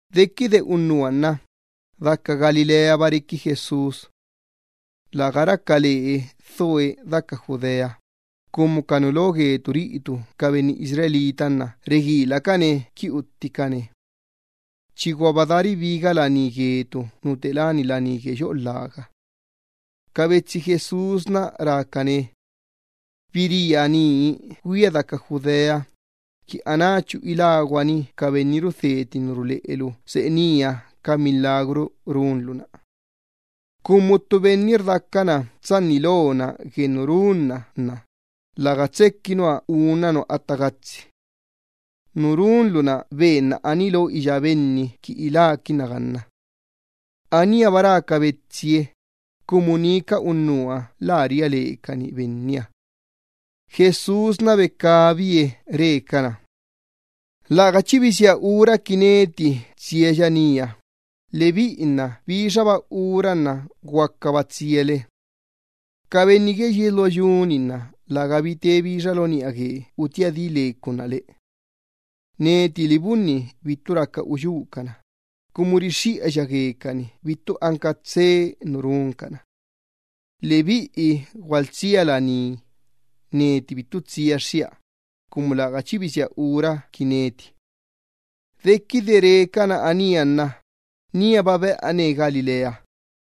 Dequide unnuha nna, daca Galileaba requi Jesús. Läga raca lee dhoe deca Judea, cumu ca nu lo gue ca benni Israel nna reguilacane quini utticane. Chiguaba daa ribiga laní gue ca benni Israel nu te láni laní gue yoꞌo lhaga. Ca betsi Jesús rácane: —Biría nii güia daca Judea, qui anáchu iláguani ca biꞌini rudheti ca tisa ruleꞌelu seꞌe nía ca milagru runlu-na. Cumu ttu benni rdacana tsanni lona gue nu runna nna läga tsequi nua unna nua atta gatsi. Nu runlu-na benna aní lo iyá benni quini iláquinna. Aníaba rá ca betsi Benniha, cumu ni ca unnuha bittu ria lecanie. Jesús becabie re cana: —Läga chi bisía ura quia qui tsiaya nía, lebiꞌi nna bixaba ura nna guacaba tsiale. Ca benni gue yies lo yu-ni nna lägabi te bixa lo niꞌa gue utía di le ca unná le. Neti libunni bittu raca uyúcana, cumu rixxiꞌaya guecani bittu anca tsee nu runcana. Lebiꞌi gualtsia laní, neti bittu tsiaxxia, cumu läga chi bisía ura qui neti. Dequide re cana anía nna níaba beꞌane Galilea.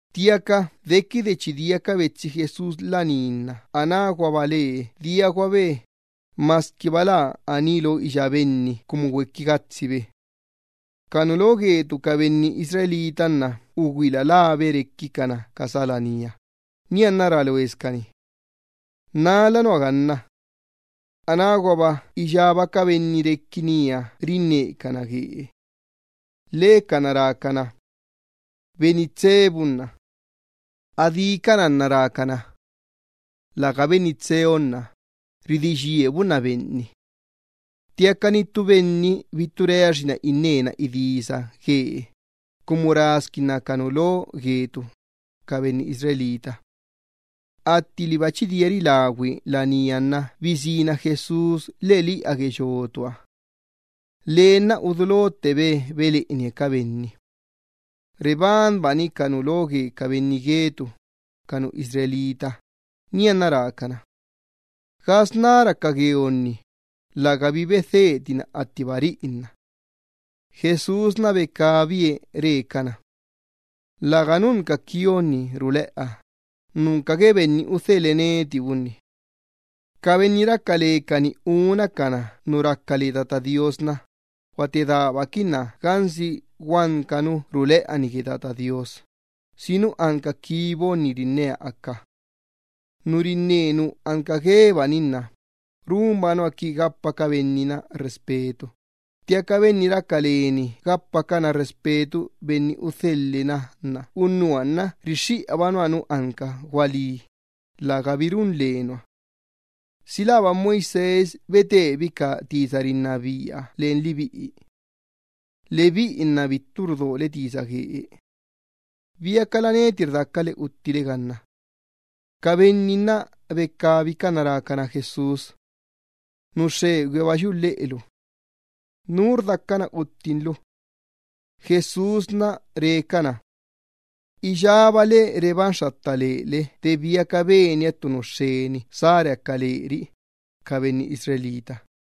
Ttiaca dequide chi dia ca betsi Jesús laní nna anáguaba lee diaguabe, masquiba lä aní lo iyá benni cumu güequi gatsibe. Ca nu lo guetu, ca benni Israel nna ugüila labe requicana ca sá laníha, nianna rá loescani: “¿Nala nua ganna?” Anáguaba iyába ca benni requi nía rinnecana guee. Lhecana rácana: “Benni tsee bunna.” Adícana nna rácana: “Läga benni tseeonna, ridí yie bunna benni.” Ttiaca ni ttu benni bittu reaxinna innena idisa guee, cumu rasquinna ca nu lo gue ca benni Israel. Atti liba chi dia rilagüi laníha nna bisína Jesús lheꞌeliꞌa gue yotuha. Lee nna udulottebe beleꞌenie ca benni. Rebanbani ca nu lo gue ca benni Israel, nianna rácana: —¿Gasná raca gueonni? Inqui lägabi bedhetina attiba riꞌi nna. Jesús becabie re cana: —Läga nunca quionni ruleꞌa, nunca gue Benni udhelhe neti bunni. Ca benni raca lecani uncana nu raca le Tata Do Iyyabaaha nna guate daabaquinna gansi guanca nu ruleꞌa-ni gue Tata Do Iyyabaaha, si nu anca quiba rinnea aca. Nu rinne nu anca guebani nna runba nua qui gapa ca benni-na respeto, ttiaca benni raca leni gapacana respeto benni udhele na, unnuha nna rixxiꞌaba nua nu anca gualí, lägabi run le nua. ’¿Si läba Moisés bocaꞌanbi ca ley-na len lebiꞌi? Lebiꞌi nna bittu rudole tisa guee. ¿Biacala neti rdacale uttile ganna? Ca benni nna becabicana rácana Jesús: —¡Nu xxegüihaba yuꞌu lheꞌelu! ¿Nú rdacana uttin lu? Jesús re cana: —Iyábale rebanxxatta lele de biaca benia ttu nu xxeni sá reaca leri, ca benni Israel.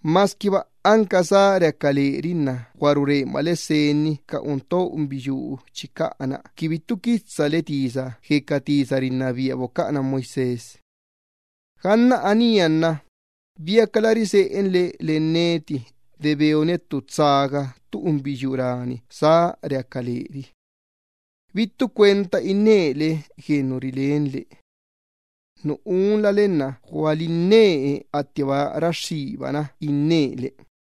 Masquiba anca sá redí leri nna rurencana senni ca unto chicaꞌa-na qui bittu quitsale tisa gue ca ley bocaꞌana Moisés. Ganna anía nna ¿biacala riseꞌenle len neti de beonia ttu tsaga ttu unbiyuu rani sá redí leri? Bittu cuenta innele gue nu rilenle. Nu unlale nna gualinne attiba raxxíbana innele.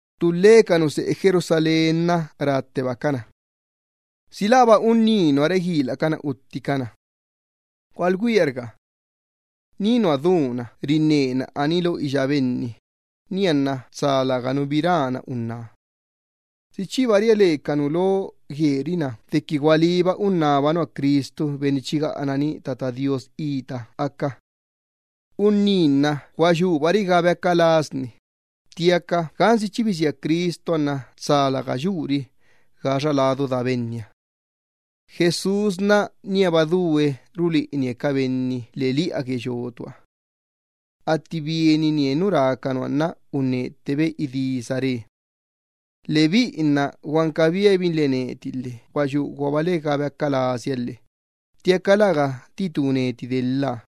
Ttulhe ca nu seꞌe Jerusalén nna ráttebacana: —¿Si läba unní nua reguilacana utticana? Gualugüiarga. Ni nua duna rinnena aní lo iyá benni, nianna tsa läganu bi rán unná. ¿Si chiba ria le ca nu lo gueri-na dequi gualíba unnába nua Cristu benni chi gaꞌanani Tata Do Iyyabaaha ita aca? Unní nna gua yubari ga beaca lasni, ttiaca gansi chi bisía Cristuha nna tsa läga yuri gaxa ladu daa Benniha. Jesús níaba due ruleꞌenie ca benni lheꞌeliꞌa gue yotuha. Atti bieninie nu rá ca nua nna unnettebe idisa re: —¡Lebiꞌi nna guanca biabinle neti lhe gua yuguale ga beaca lasia lhe, ttiaca läga titú neti delha!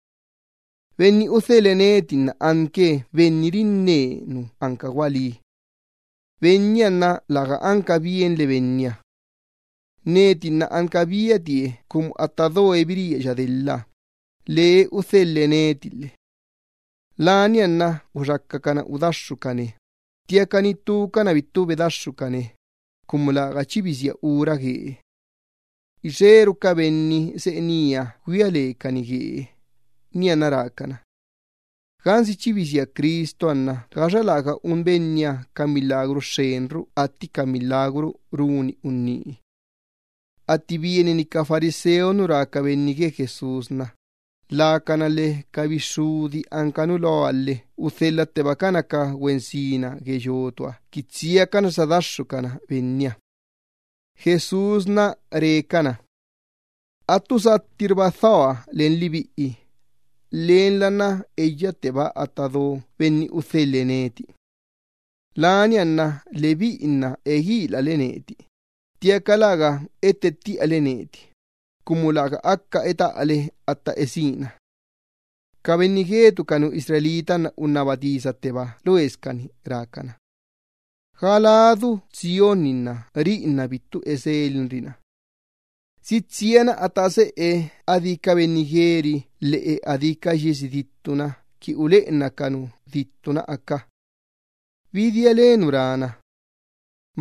Benni udhelhe neti nna anque Benni rinne nu anca gualí. Lebiꞌi nna läga anca bienle Benniha. Neti nna anca biatie cumu atta doe biríaya delha, lee udhelhe neti lhe. Lania nna uxacacana udaxxucane, ttiaca ni ttucana bittu bedaxxucane, cumu läga chi bisía ura guee. Ixeru ca benni seꞌe nía güia lecani guee, nianna rácana: —Gansi chi bisía Cristuha nna ¿si xxenrula anca ca milagru un Benniha atti ca milagru runi unní? Atti bienini ca fariseo gue nu rá ca benni rinnecana gue Jesús, lacana lhe ca bixxudi anca nu loha lhe udhelhattebacana ca güensina gue yotuha qui tsiacana sadaxxucana Benniha. Laniala rá Jesús cana: —Attu sattirba dhoa len lebiꞌi, lenla nna eyaꞌatteba atta do Benni udhelhe neti. Lania nna lebiꞌi nna eguilale neti, ttiaca läga ettettiꞌale neti, cumu läga aca etaꞌale atta esína. Ca benni Israel nna unnaba tisatteba loescani rácana: —¿Ga ladu tsionni, riꞌi nna bittu eselinri na? ¿Si tsiana atta seꞌe adí ca benni gueri lheꞌe adí ca yiesi dittu-na qui uleꞌenna ca nu dittu-na aca? ¿Bi diale nu rán-na: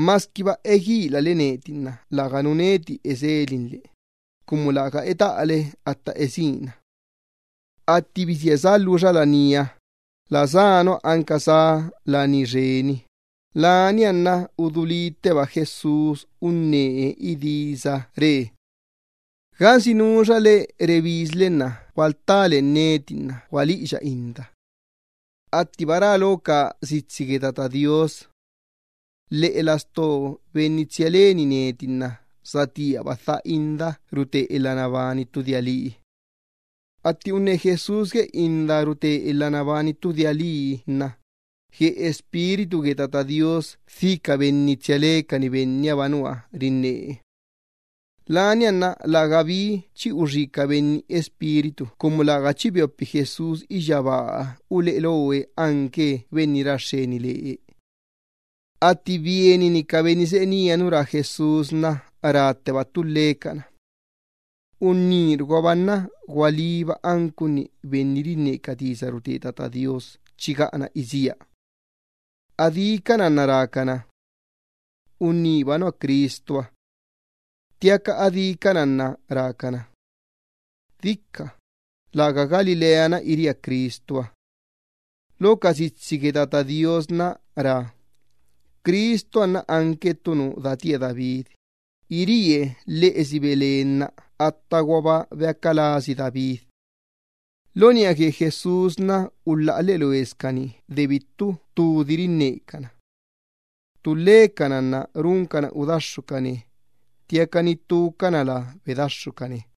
“Masquiba eguilale neti nna läganu neti eselinle, cumu läga etaꞌale atta esína”? Atti bisía sá lhuxa laníha, la sá nua anca sá laní xeni, lania nna udulítteba Jesús unnee idisa re: —Gansi nuxale rebisle nna gualtá len neti gualiꞌiya inda. Attiba rá lo ca sitsi gue Tata Do Iyyabaaha: “Lheꞌe lastoo benni tsia leni neti nna satíaba dha inda rute elha nabani ttu dia lii.” Atti unne Jesús gue inda rute elha nabani ttu dia lii nna gue Espíritu gue Tata Do Iyyabaaha dhi ca benni tsia lecani Bennihaba nua rinnee. Lania nna lägabi chi uxí ca benni Espíritu cumu läga chi beopi Jesús iyyabaaha uleꞌe loe anque Benni ra xxeni lee. Atti bienini ca benni seꞌe nía nu rá Jesús, rátteba ttulhecana: —Bennirguaba nna gualíba anque profeta chi gaꞌana isía. Adícana nna rácana: —Benniba nua Cristuha. Ttiaca adícana nna rácana: —Dica, läga Galilea-na iría Cristuha. Lo ca sitsi gue Tata Do Iyyabaaha nna rá: “Cristuha nna anque ttu nu datía David, iríe lheꞌesi Belén nna attaguaba beaca lasi David.” Lo niꞌa gue Jesús, ulhaꞌa lheꞌe loescani de bittu ttudi rinnecana. Ttulhecana nna runcana udaxxucane, ttiaca ni ttucana lä bedaxxucane.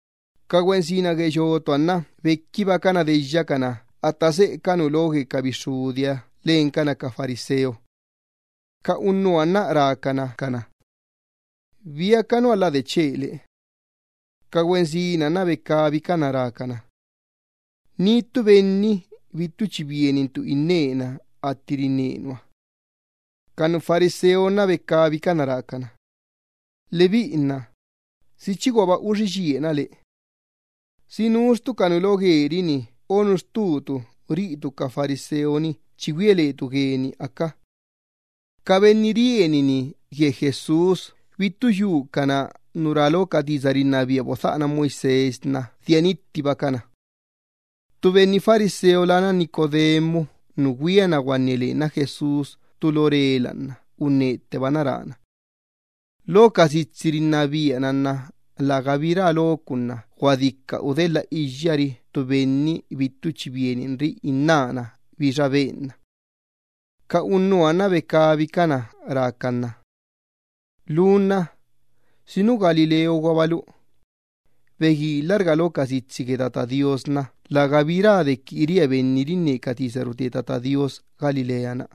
Ca güensina gue yotuha nna bequibacana deyyacana atta seꞌe ca nu lo gue ca bixxudiha lencana ca fariseo. Ca unnuha nna rácana ca güensinaha: —¿Biaca nua lä dechele? Ca güensinaha nna becabicana rácana: —¡Ni ttu benni bittu chi bienintu innena atti rinne nua! Ca fariseo nna becabicana rácana: —Lebiꞌi nna, ¿si chiguaba uxí yie nua le? ¿Si nux ttu ca nu lo gueri-ni o nux ttuttu riꞌitu ca fariseo-ni chi güia letu gueni aca? Ca benni rienini gue Jesús bittu yucana gue nu rá lo ca ley bodhaꞌana Moisés, dia nittibacana. Ttu benni fariseo lána Nicodemo nu güiana guanne lenna Jesús ttu lo rela nna unnettebana rána: —Lo ca ley-na rá: “Läga dica udelha iyyari ttu benni bittu chi bieninri innána bixa benna.” Ca unnuha nna becabicana rácan na: —Lu nna ¿si nu Galileoguabalu? Beguilarga lo ca sitsi gue Tata Do Iyyabaaha, tsa lägabi rixxiꞌa dequi chi biría ttu profeta Galilea-na.